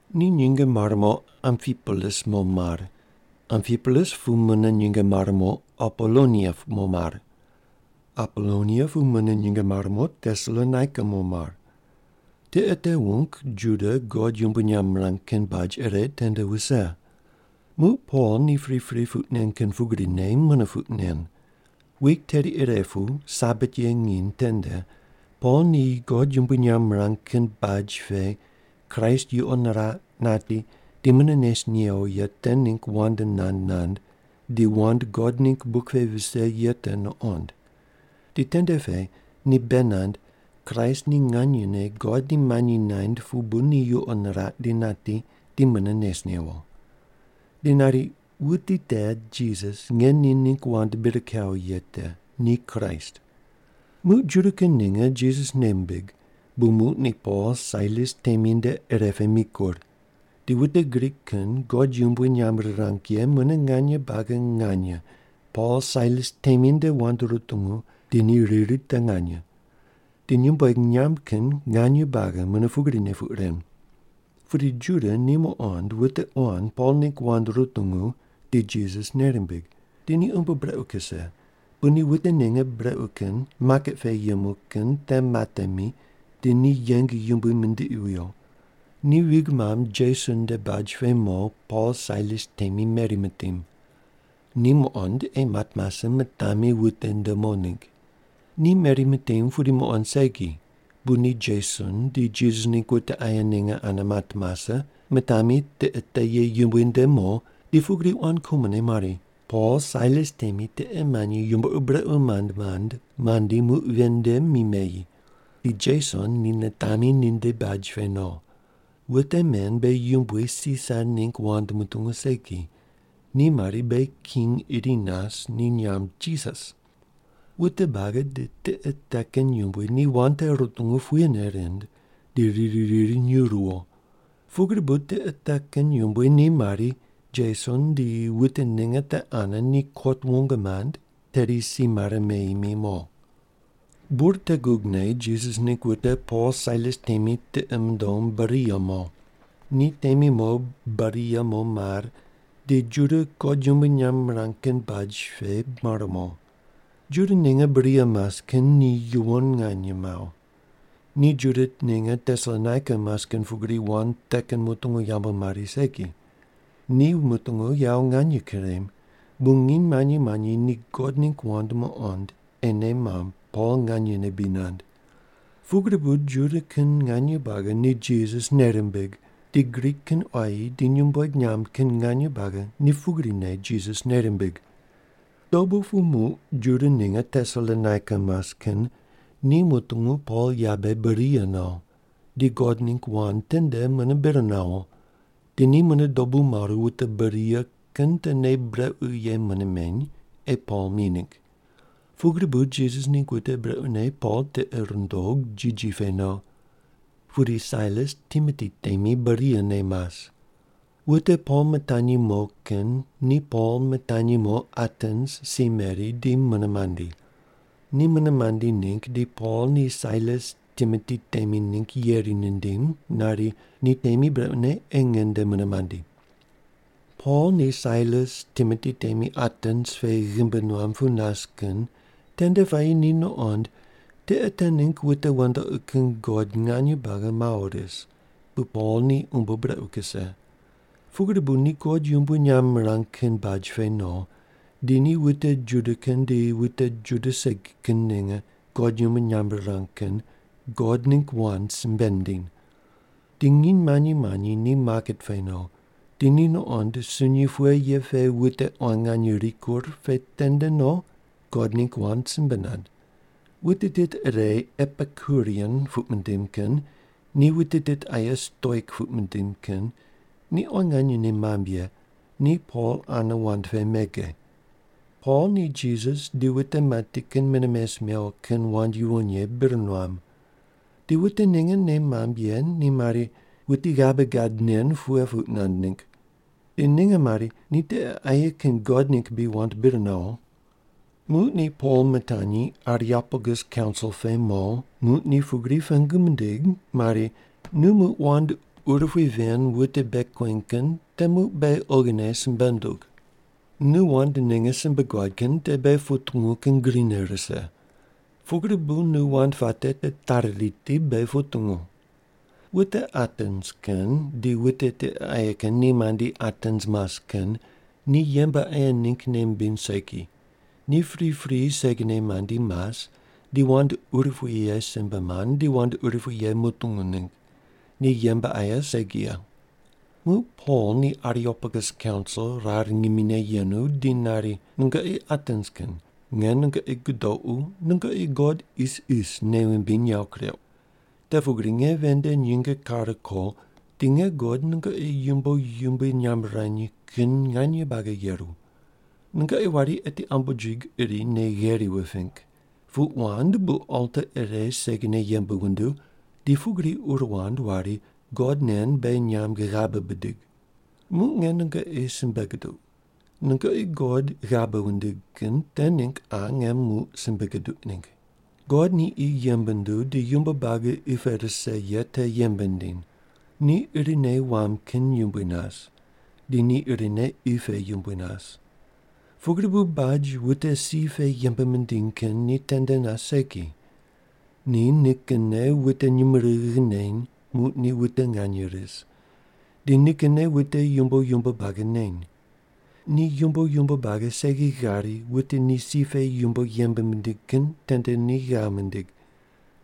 Ni nyinge mare mo Ampipolis mo mar. Ampipolis pu mune nyinge mare mo Apolonia mo mar. Apolonia pu mune nyinge mare mo Tesalonaika mo mar. Tiqe te wung Juda God yumbui nyamb mirang kin baj ire tende wuse. Muq Pol ni pripri puq nen kin pugrine mune puq nen. Wik teri ire pu Sabat ye nginy tende Pol ni God yumbui nyamb mirang kin baj pe Kraist yuqo niraq, nati di mune nes newo ye te ningg wand nand nand di wand God ningg buk pe vise ye te nuqond. Di tende pe ni bei nand Kraist ni nganyene God ni manyi naind pu bu ni yuqo niraq di nati, di mune nes newo. Di nari, “Wuti te Jisas nge ni ningg wand bir kawo ye te, ni Kraist.” Muq Juda kin ninge Jisas nei mimbig, bu muq ni Pol Sailas temi nde ire pe mikur. Di wute Grik kin God yumbui nyamb rirang ye mune nganye buagi nganye Pol Sailas temi nde wand rutungu, di ni riri te nganye. Di nyumbueg nyamb kin nganye buagi mune pugrine puq ren. Pudi Juda ni muqond wute quan Pol ningg wand rutungu di Jisas nei rimbig, di ni umbo brequ kuse, bu ni wute ninge brequ kin maket pe yemu kin te matemi di ni yeng yumbui mindiqi wuyo. Ni vig mamb Jeson nde baj pe mo Pol Sailas temi meri mitim. Ni muqond ei mat mase mitami wute nde mo ningg. Ni meri mitim pudi muqond segi, bu ni Jeson di Jisas ningg wute aye ninge ane mat mase, mitami tiqe te ye yumbui nde mo di pugri quan kumone mari, “Pol Sailas temi tiqe manyi yumbo ur brequ mand mand mandi muq ven nde mi meyi. Di Jeson ni nitami ninde baj pe no. Wute men beghi yumbui Sisar ningg wand mutungu segi. Ni mari, ‘Beghi king iri nas, ni nyamb Jisas’.” Wute buagi di tiqe te kin yumbui ni wand te rutungu puyene rind, di riri riri nyuw ruwo. Pugri bu tiqe te kin yumbui ni mari Jeson di wute ninge te ane ni kot wong mand tedi si mare meyi mi mo. Bur te gugne Jisas ningg wute Pol Sailas temi tiqi mundom Beria mo. Ni temi mo Beria mo mar, di Juda God yumbui nyamb mirang kin baj pe mar mo. Juda ninge Beria mas kin ni yuwon nganye mawo. Ni Juda ninge Tesalonaika mas kin pugri wand te kin mutungu yambu mari segi. Ni wand mutungu yawo nganye kurem, bu nginy manyi manyi ni God ningg wand muqond, ei nei mamb Pol nganyene bri nand. Pugri bu Juda kin nganye buagi ni Jisas nei rimbig, di Grik kin quayi di nyumbueg nyamb kin nganye buagi ni pugrine Jisas nei rimbig. Dobu pu muq Juda ninge Tesalonaika mas kin ni mutungu Pol yabe Beria no di God ningg wand tende mune bir nawo, di ni mune dobu maru wute Beria kin te nei brequ ye mune meny ei Pol mi ningg. Pugri bu Jisas ningg wute brequne Pol tiqi rindog jiji pe no. Pudi Sailas Timoti temi Beria ne mas. Wute Pol mitanyi mo kin ni Pol mitanyi mo Atens si meri di mune mandi. Ni mune mandi ningg, di Pol ni Sailas Timoti temi ningg yeri nindim nari, “Ni temi brequne ei nge nde mune mandi.” Pol ni Sailas Timoti temi Atens pe ghimbi nuam pu nas kin tende puayi ni nuqond tiqe te ningg wute wandoqi kin god nganye buagi mawo ris, bu Pol ni umbo brequ kuse. Pugri bu ni God yumbui nyamb mirang kin baj pe no, di ni wute Juda kin di wute Juda segi kin ninge God yumbui nyamb rirang kin God ningg wand simbe nindiny. Di nginy manyi manyi ni maket pe no, di ni nuqond sunyi pughe ye pe wute quan nganye rikur pe tende no God ningg wand simbe nand. Wute tit ire Epikurian puq mindim kin di wute tit aye Stoik puq mindim kin ni quan nganye nei mamb ye ni Pol ane wand pe mege. Pol ni Jisas di wute mati kin mune mes mewo kin wand yuwon ye bir nuam. Di wute ninge nei mamb ye ni mari, “Wuti ghabe gad nen pughe puq nand ningg?” Di ninge mari, “Ni tiqe aye kin god ningg bri wand bir nawo?” Muq ni Pol mitanyi Areopagus kaunsil pe mo, muq ni pugri pengu mindig mari, “Nu muq wand urupui ven wute bei kueny kin te muq beghi oghine simbe ndug. Nu wand ninge simbe guad kin te beghi putungu kin grine rise. Pugri bu nu wand puate te tari riti, beghi putungu.” (Wute Atens kin di wute tiqe aye kin ni mandi Atens mas kin ni yembe aye ningg nei mimbiny segi, ni pripri segine mandi mas, di wand urupui ye simbe mand, di wand urupui ye mutungu ningg. Ni yembe aye segi ye.) Muq Pol ni Areopagus kaunsil rar ngimine yenu di nari, “Nungoqi Atens kin, nge nungoqi gudoqu, nungoqi god isis nei wumbiny yawo kureuq. Te pugri nge ven nde nyinge kare ko di nge guqod nungoqi yumbo yumbui nyamb wurany kin nganye buagi yeru. Nungoqi wari eti ambojig iri nei gheri wuping. Puq wand bu alta ire segine yembe wunduw, di pugri ur wand wari: ‘god nen beghi nyamb ghabe bidig.’ Muq nge nungoqi simbe guduq. Nungoqi God ghabe wundig kin te ningg qa nge muq simbe guduq ningg. “God ni qi yembe nunduw di yumbo buagi qi pe rise ye te yembe nindiny. Ni irine wam kin yumbui nas, di ni irine qi pe yumbui nas. Pugri bu baj wute si pe yembe mindiny kin ni tende nas segi. Ni nikinne wute nyumurighi neny muq ni wute nganye ris, di nikinne wute yumbo yumbo buagi neny. Ni yumbo yumbo buagi segi ghari wute ni si pe yumbo yembe mindiny kin tende ni ghav mindig.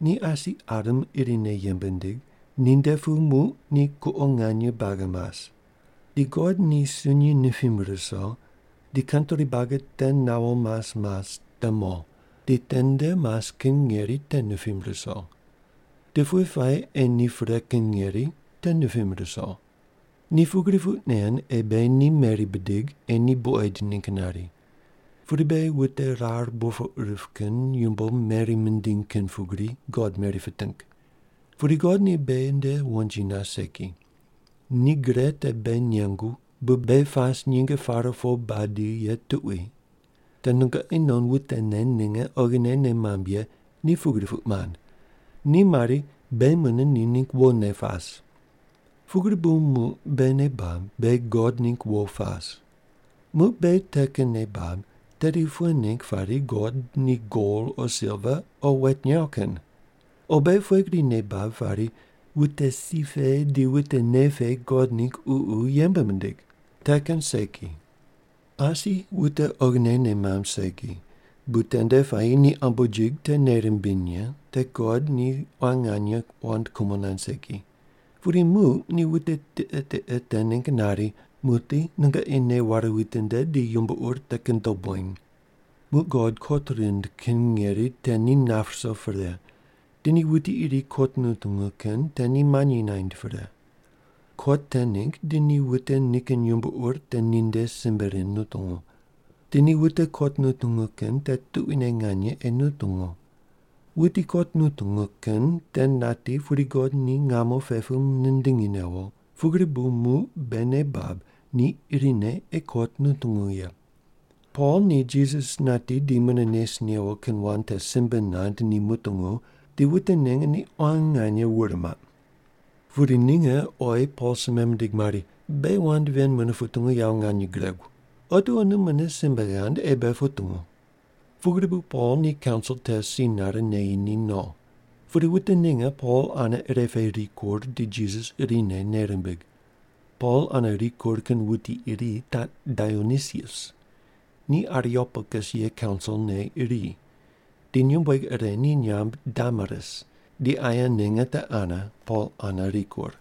Ni asi Adam irine yembe nindig, ninde pu muq ni kuqo nganye buagi mas. Di God ni sunyi nipim ruso, di kantri buagi te nawo mas mas te no, di tende mas kin ngeri te nipim ruso. Di pughe puayi ei ni pre kin ngeri te nipim ruso. Ni pugri puq nen, ei beghi ni meri bidig, ei ni buqoid ningg nari. Pudi beghi wute rar burpoq rip kin yumbo meri mindiny kin pugri God meri piting. Pudi God ni beghi nde wonji nas segi. Ni gre te beghi nengu bu beghi pas nyinge pare po badi ye tuqui. Te nungoqi non wutene ninge oghine nei mamb ye ni pugri puq mand. Ni mari, ‘Beghi mune ni ningg wone pas.’ “Pugri bu muq beghi nei bab, beghi God ningg wo pas. Muq beghi te kin nei bab, tedi pughe ningg pari God ni gol o silva o wet nyaw kin? O beghi pughe gri nei bab pari, wute si pe di wute nei pe God ningg ququ yembe mindig? Te kin segi. Asi wute oghine nei mamb segi, bu tende puayi ni ambojig te nei rimbiny ye te God ni quan nganye wand kumo nand segi. Pudi muq ni wute tiqe tiqe te ningg nari, ‘Muqdi nungoqi nei ware witinde di yumbo ur te kin dob weny.’ “Muq God kot rind kin ngeri te ni nap ruso pre, di ni wuti iri kot nutungu kin te ni manyi naind pre. Kot te ningg di ni wute nikin yumbo ur te ninde simbe rind nutungu. Di ni wute kot nutungu kin te tuquine nganye ei nutungu. Wuti kot nutungu kin te nati pudi God ni ngamo pe pu nindingi newo, pugri bu muq beghi nei bab ni irine ei kot nutungu ye.” Pol ni Jisas nati di mune nes newo kin wand te simbe nand ni mutungu di wute ninge ni quan nganye wur maq. Pudi ninge oyi Pol simbe mindig mari, “Beghi wand ven mune putungu yawo nganye guregu. Otiwo nu mune simbe ghand ei beghi putungu.” Pugri bu Pol ni kaunsil te si nare neyi ni no. Pudi wute ninge Pol ane ire pe rikur di Jisas irine nei rimbig. Pol ane rikur kin wuti iri taq Dionisius. Ni Areopagus ye kaunsilne iri. Di nyumbueg ire ni nyamb Damaris, di aye ninge te ane Pol ane rikur.